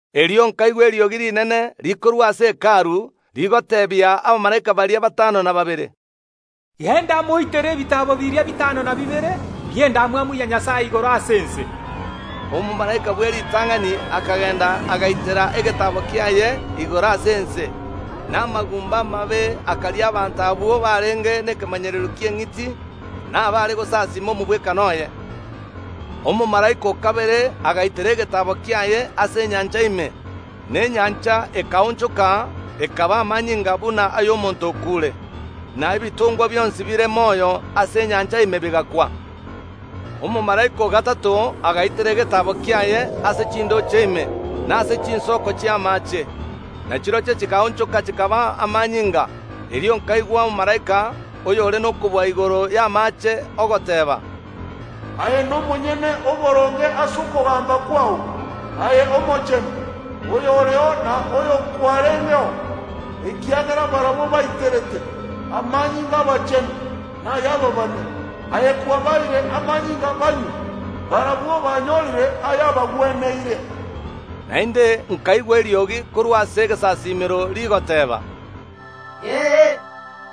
Erio nkaigwa eriogi rinene rikorwa ase Hekalu, rigoteebia abamalaika baria batano na babere, “Genda moitere ebitaabo biria bitano na bibere bi’endamwamu ya Nyasae igoro ase ense.” Omomalaika bw’eritang’ani akagenda agaitera egetaabo kiaye igoro ase ense, na amagumba amabe akaria abanto abwo barenge nekemanyererio ki’eng’iti, na baare gosasiima omogwekano oye. Omomalaika o kabere agaitera egetaabo kiaye ase enyancha ime, na enyancha ekaonchoka ekaba amanyinga buna ay’omonto okuure, na ebitongwa bionsi bire moyo ase enyancha ime bigakwa. Omomalaika o gatato agaitera egetaabo kiaye ase chindooche ime, na ase chinsoko chi’amaache, na chirochio chikaonchoka chikaba amanyinga. Erio nkaigwa omomalaika, oyore nokobua igoro y’amaache, ogoteeba, “Aye nomonyene oboronge ase okogamba kwao, aye Omochenu, oyoreo na oyokwarengeo. Ekiagera barabwo baiterete amanyinga ’abachenu na ay’ababani, aye kwabaeire amanyinga banywe. Barabwo banyorire ayabagweneire!” Naende nkaigwa eriogi korwa ase egesasiimero rigoteeba, “Ee,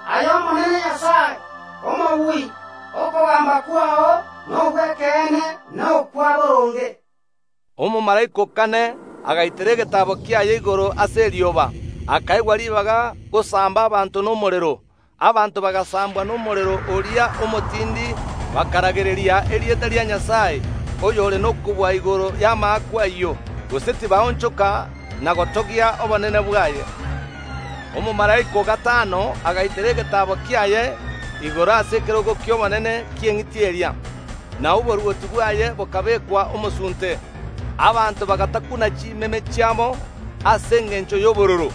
aye Omonene Nyasae Omobui, okogamba kwao nogw’ekeene na okwa boronge!” Omomalaika o kane agaitera egetaabo kiaye igoro ase erioba, akaegwa ribaga gosamba abanto nomorero. Abanto kobagosambwa nomorero oria omotindi bakaragereria erieta ria Nyasae, oyore nokobua igoro y’amaakwa ayio, gose tibaonchoka na gotogia obonene bwaye. Omomalaika o gatano agaitera egetaabo kiaye igoro ase ekerogo ki’obonene ki’eng’iti eria, na oborwoti bwaye bokabekwa omosunte. Abanto bagatakuna chimeme chiabo ase engencho y’obororo,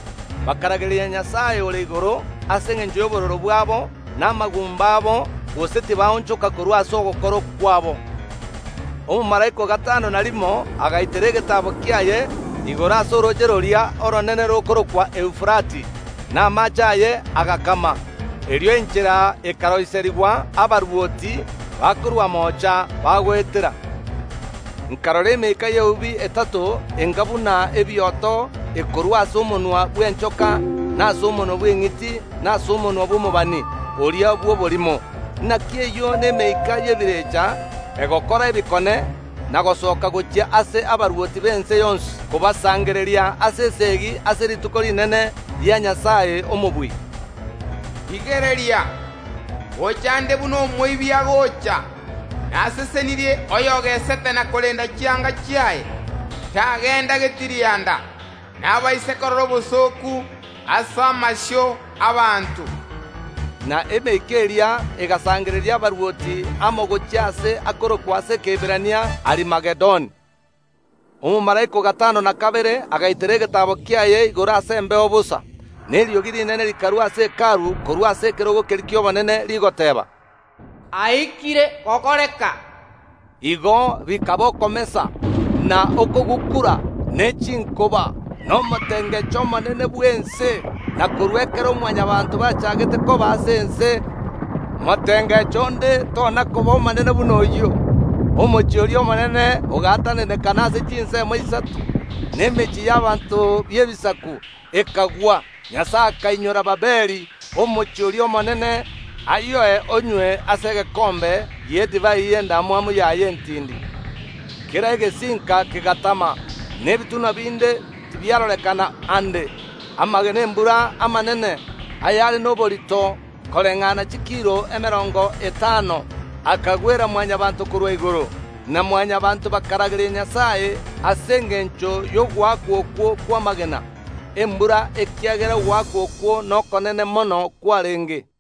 bakaragereria Nyasae ore igoro ase engencho y’obororo bwabo na amagumba abo, gose tibaonchoka korwa ase ogokora kwabo. Omomalaika o gatano na rimo agaitera egetaabo kiaye igoro ase orooche roria oronene rokorokwa Eufarati, na amaache aye agakama. Erio enchera ekaroiserigwa abarwoti bakorwa moocha bagoetera. Nkarora emeika y’eubi etato enga buna ebioto ekorua ase omonwa bw’enchoka, na ase omonwa bw’eng’iti, na ase omonwa bw’omobani oria bw’oborimo. Naki eyio nemeika y’ebirecha egokora ebikone, na gosoka gochia ase abarwoti b’ense yonsi kobasangereria ase esegi ase rituko rinene ria Nyasae Omobui. (“Rigereria, ngocha nde buna omoibi agocha. Nasesenirie oyogesete na korenda chianga chiaye, tagenda getirianda, na abaise korora obosooku ase amasio ’abaanto.”) Na emeika eria egasangereria abarwoti amo gochia aase akorokwa ase Ekeiberania Arimagedon. Omomalaika o gatano na kabere agaitera egetaabo kiaye igoro ase embeo bosa, na eriogi rinene rikarua ase Hekalu korwa ase ekerogo keria ki’obonene, rigoteeba, “Aikire gokoreka!” Igo bikaba okomesa, na okogukura, ne chinkoba, na omotengecho omonene bw’ense. Na korwa ekero Mwanyabaanto bachaagete koba ase ense motengecho onde tona koba omonene buna oyio. Omochie oria omonene ogaatananekana ase chinsemo isato, na emechie y’abanto b’ebisaku ekagwa. Nyasae akainyora Babiloni, omochie oria omonene, ayoe onywe ase egekombe ki’edivai y’endamwamu yaye entindi. Kera egesinka kegatama, na ebitunwa binde tibiarorekana aande. Amagena ’embura amanene, ayare noborito koreng’ana chikiro emerongo etano, akagwera Mwanyabaanto korwa igoro, na Mwanyabaanto bakaragereria Nyasae ase engencho y’ogoakwa okwo kw’amagena ’embura ekiagera ogoakwa okwo nokonene mono kwarenge.